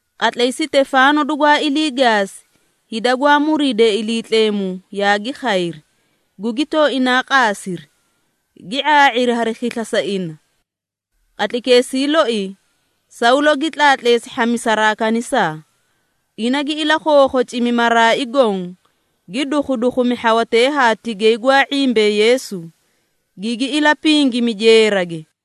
Qatlay Sitefaano dugwaa ilii gaasi, hida gwaa muriidee Iliitleemu yaagi khayri, gugi tooinaa qaasiri, gi ⁄aa⁄iri hari khisla sa ina. Qatlaykeesii loi, Sawlo gi tlaatleesi hhamisaraa kanisaa. Ina gi ilakhookhocimi maraai goõ, gi dukhudukhumi hhawatee haa tigay gwaa ⁄imbee Yeesu, gigi ilapingimi jeerage.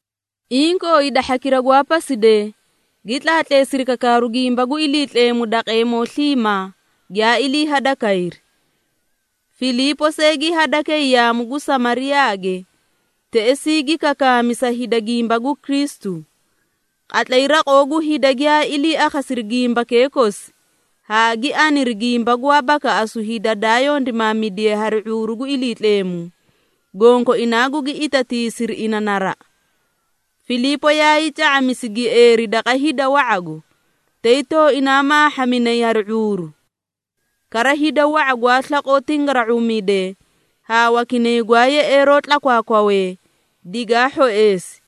Inkoo hida hhakira gwaa pasidee, gi tlaatleesiri kakaaru gimba gu Iliitleemu daqeemoo sliimaa giyaa ilii hadakayri. Filiipo see gi hadakay yaamu gu Samariyaage, teꞌesii gi kakaami sa hida gimba gu Kristu. Qatlay raqoo gu hida giyaa ilii akhasiri gimbakee kosi, haa gi aniri gimba gwaa bakaꞌasu hida daa yondimaamidiye hari ⁄uuru gu Iliitleemu, gonkoinaa gugi itatiisiri ina naraꞌa. Filiipo yaay ca⁄amisi gieeri daqa hida wa⁄ago, tay tooinaa maahhaminay hari ⁄uuru. Kara hida wa⁄a gwaa slaqoo tingara⁄uumidee haa wakinay gwaa yeꞌeeroo tlakwaakwawee, digaa hhoeesi.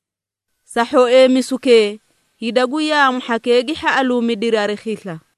Sa hhoeemisukee, hida gu yaamu hhakee gi hhaꞌaluumidiri hari khisla.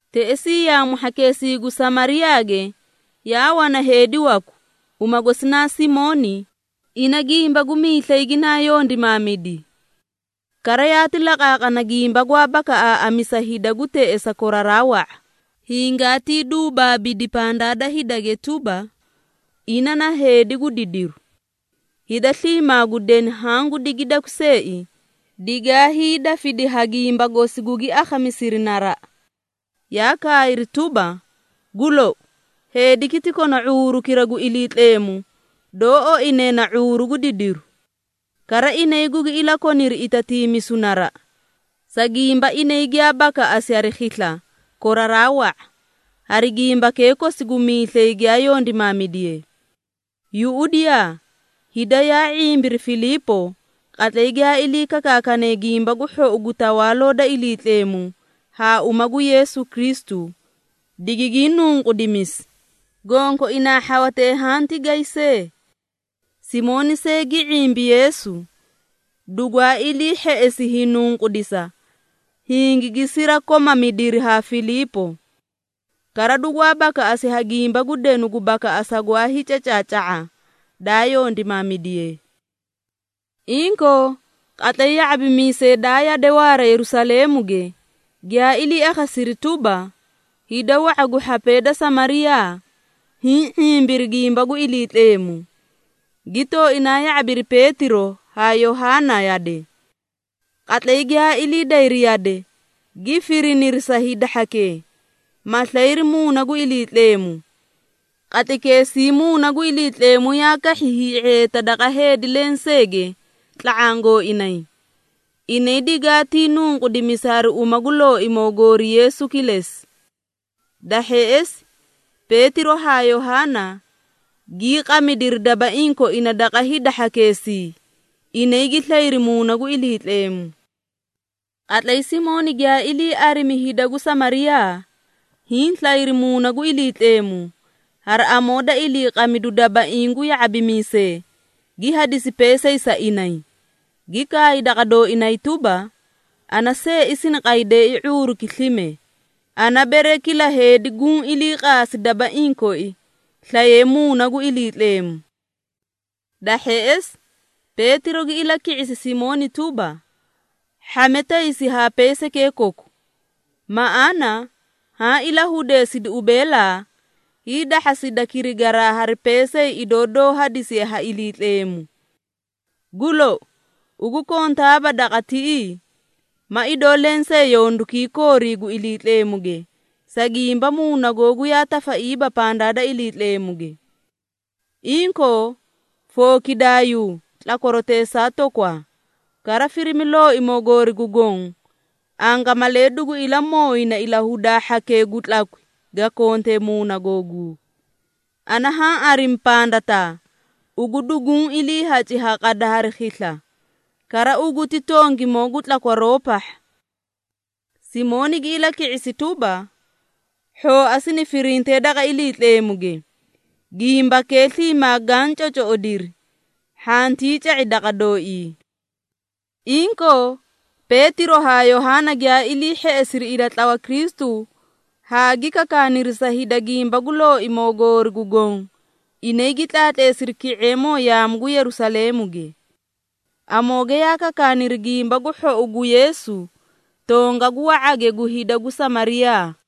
Teꞌesii yaamu hhakeesii gu Samariyaage yaa wana heedi waku, uma gosi naa Simooni, ina gimba gu miislay ginaa yondimaamidi. Kara yaati laqaaqana gimba gwaa bakaꞌaaꞌamisa hida gu teꞌesa koraraa wa⁄a, hingaatii duubaabidi pandaa da hidage tuba, ina na heedi gu didiru. Hida sliimaa gu deni haã gu digiidakwi seei, digaa hiidafidi ha gimba gosi gugi akhamisiri naraꞌa, yaa kaayri tuba, “Gu lou, heediki ti kona ⁄uurukira gu Iliitleemu, doó oine na ‘⁄uuru gu Didiru.’” Kara inay gugi ilakoniri itatiimisu naraꞌa, sa gimba inay giyaa bakaꞌasi hari khisla koraraa wa⁄a, hari gimbakee kosi gu miislay giyaa yondimaamidiye. Yuꞌudiyaa, hida yaa ⁄imbiri Filiipo, qatlay giyaa ilii kakaakane Gimba gu Hhou gu Tawaaloo da Iliitleemu haa uma gu Yeesu Kristu, digigii nunqudimisi, gonkoinaa hhawatee haã tigay see. Simooni see gi ⁄imbi Yeesu, dugwaa ilii hheꞌesi hiinunqudisa, hingigi sirakomamidiri haa Filiipo. Kara dugwaa bakaꞌasi ha gimba gu denu gu bakaꞌasa gwaa hiicacaaca⁄a, daa yondimaamidiye. Inkoo qatlay ya⁄abimiisee daa yade waara Yerusaleemuge, giyaa ilii akhasiri tuba, hida wa⁄a gu hhapee da Samariyaa hiĩ ⁄imbiri gimba gu Iliitleemu, gi tooinaa ya⁄abiri Peetiro haa Yohaana yade. Qatlay giyaa ilii dayri yade, gi firiniri sa hida hhakee, ma slayri Muuna gu Iliitleemu. Qatlaykeesii Muuna gu Iliitleemu yaa kahhi hii⁄eeta daqa heedi lenseege tla⁄aã gooinay, inay digaatii nunqudimisi hari uma gu Looimoo goori Yeesu kilesi. Da hheꞌesi Peetiro haa Yohaana gii qamidiri dabaiĩ koina daqa hida hhakeesii, inay gi slayri Muuna gu Iliitleemu. Qatlay Simooni giyaa ilii arimi hida gu Samariyaa, hiĩ slayri Muuna gu Iliitleemu, hari amoo da iliiqamidu dabaiĩ ha ya⁄abimiisee, gi hadisi peesay sa inay, gi kaay daqa dooinay tuba, “Ana seei sini qaydeei ⁄uuruki slime, ana bere kila heedi guũ ilii qaasi dabaiĩ koi, slaye Muuna gu Iliitleemu.” Da hheꞌesi, Peetiro gi ilaki⁄isi Simooni tuba, “Hhame taysi haa peesaykee koku, maꞌaana haã ilahudeesidi ubeelaa, hiidahhasida kirigaraa hari peesay idoo doó hadisiye ha Iliitleemu! Gu lou, ugu kontaaba daqa tiꞌii ma idoo lensee yondukii koorii gu Iliitleemuge, sa gimba muuna googu yaa tafaiiba pandaa da Iliitleemuge. Inkoo, fookidaayuu tlakwaroteesaa toogwaa, kara firimi Looimoo goori gu Goõ, angamalee dugu ilamooyina ilahudaa hhakee gu tlakwi ga konte muuna googuu. Ana haã arimi pandataa ugu duguũ iliihaci ha qada hari khisla, kara ugu ti tongimoo gu tlakwaroo pahha.” Simooni gi ilaki⁄isi tuba, “Hhooa sini firintee daqa Iliitleemuge, gimbakee sliimaa gaã cocoꞌodiri, hhantii ca⁄i daqa dooii.” Inkoo, Peetiro haa Yohaana giyaa ilii hheꞌesiri ilatlawa Kristu haa gi kakaaniri sa hida gimba gu Looimoo goori gu Goõ, inay gi tlaatleesiri ki⁄eemoo yaamu gu Yerusaleemuge. Amooge yaa kakaaniri Gimba gu Hhou gu Yeesu tongagu wa⁄age gu hida gu Samariyaa.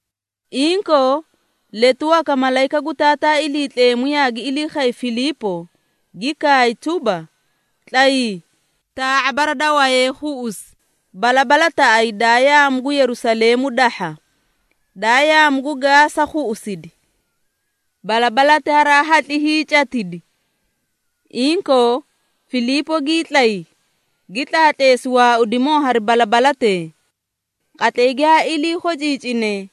Inkoo, letu waka malayika gu Taataa Iliitleemu yaagi ilii khay Filiipo, gi kaay tuba, “Tlayii, taa⁄a bara da wayee khuꞌusi balabalataꞌayi daa yaamu gu Yerusaleemu dahha, daa yaamu gu Gaasa khuꞌusidi.” (Balabalati haraa kongoqomee hiicatidi) Inkoo, Filiipo gii tlay, gi tlaatleesi waaudimoo hari balabalatee. Qatlay giyaa ilii khociicine,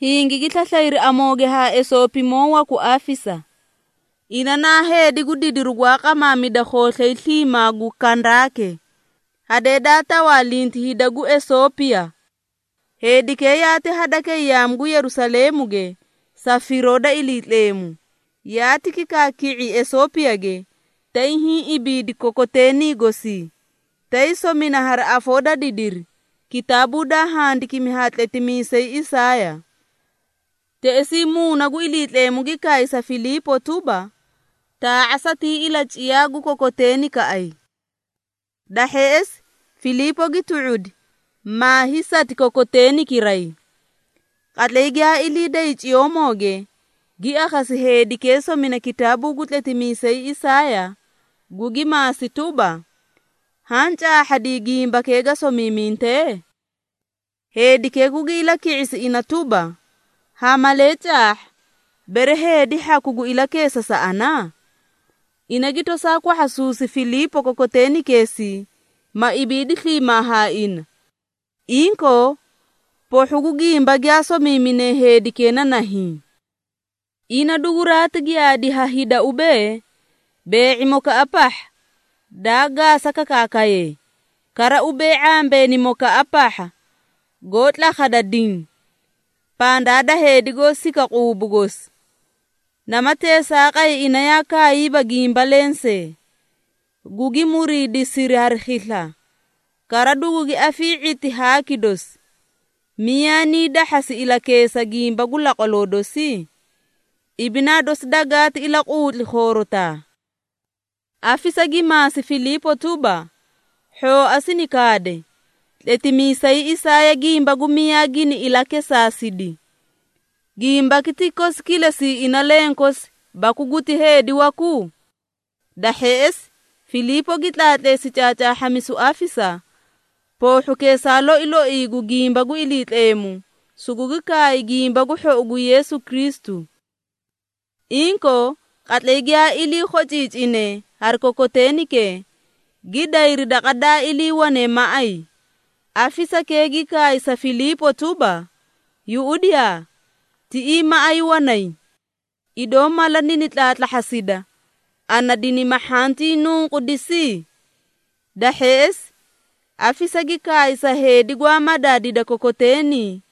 hingigi slaslayri amooge haa Esoopimoo waku afisa. Ina naa heedi gu didiru gwaa qamaamida khooslay sliimaa gu Kandaake, hadee daa tawaalinti hida gu Esoopiya. Heedikee yaati hadakay yaamu gu Yerusaleemuge sa firoo da Iliitleemu, yaati kikaaki⁄i Esoopiyage, tay hiĩ ibiidi kokoteeni gosii, tay somina hari afoo da didiri, kitaabuu daa handikimi ha tletimiisay Isaaya. Teꞌesii Muuna gu Iliitleemu gi kaay sa Filiipo tuba, “Ta⁄aa satii ilaciyaa gu kokoteenikaꞌay.” Da hheꞌesi, Filiipo gi tu⁄udi, maa hiisati kokoteenikiray. Qatlay giyaa ilii day ciyoomooge, gi akhasi heedikee somina kitaabuu gu tletimiisay Isaaya, gugi maasi tuba, “Haã caahhadii gimbakee ga somiiminte?” Heedikee gugi ilaki⁄isi ina tuba, “Ha malee caahha, bere heedi hhaku gu ilakeesa sa ana?” Ina gi tosaa kwahhasuusi Filiipo kokoteenikeesii, ma ibiidi sliimaa ha ina. Inkoo, poohhu gu gimba giyaa somiimine heedikee naa nahiĩ, “Ina duguraati giyaadi ha hida ubee, bee⁄imokaꞌa pahha, daa gaasakakaakaye, kara ubee ⁄ambeenimokaꞌa pahha goó tlakhada diĩ, pandaa da heedi goó sika quubu gosi, nama teesaaqay ina yaa kaayiiba gimba lensee. Gugi muriidisiri hari khisla, kara dugugi afii⁄iti haaki dosi, Miyaa nii dahhasi ilakeesa gimba gu laqwaloo dosi? Ibinaa dosi dagaati ilaquutli khoorotaa.” Afisa gi maasi Filiipo tuba, “Hhooa sini kaade, tletimiisay Isaaya gimba gu miyaa gini ilakesaasidi, gimbaki ti kosi kilesii ina lenkosi, baku guti heedi waku?” Da hheꞌesi Filiipo gi tlaatleesi caacaahhamisu afisa poohhukeesaa loi loi gu gimba gu Iliitleemu, sugugi kaay Gimba gu Hhou gu Yeesu Kristu. Inkoo, qatlay giyaa ilii khociicinee hari kokoteenikee, gi dayri daqa daa iliiwane maꞌay, afisakee gi kaay sa Filiipo tuba, “Yuꞌudiyaa tiꞌii maꞌay wanay! Idoo mala nini tlaatlaahhasida, ana dinima hhantii nunqudisi?” Da hheꞌesi, afisa gi kaay sa heedi gwaa madaadida kokoteeni,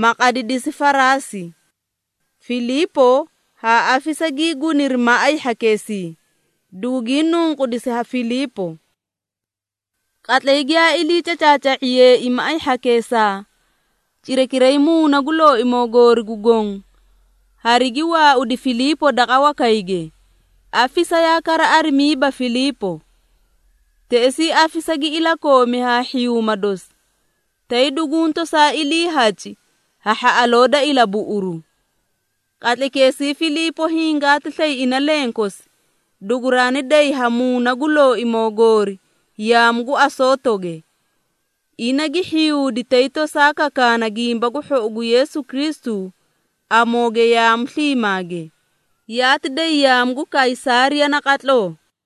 ma qadidisi faraasi. Filiipo haa afisa gii guniri maꞌay hhakeesii, dugugii nunqudisi ha Filiipo. Qatlay giyaa ilii cacaaca⁄iyeei maꞌay hhakeesaa, cirakiray Muuna gu Looimoo goori gu Goõ harigi waaudi Filiipo daqa wakayge, afisa yaa kara arimiiba Filiipo. Teꞌesii afisa gi ilakoomi haa hhiyuuma dosi, tay duguũ tosaa iliihaci ha hhaꞌaloo da ilabuꞌuru. Qatlaykeesii Filiipo hingaati slay ina lenkosi, duguraani day ha Muuna gu Looimoo goori yaamu gu Asootoge. Ina gi hhiyuudi tay tosaa kakaana Gimba gu Hhou gu Yeesu Kristu amooge yaamu sliimaage, yaati day yaamu gu Kaysaariya naqatloo.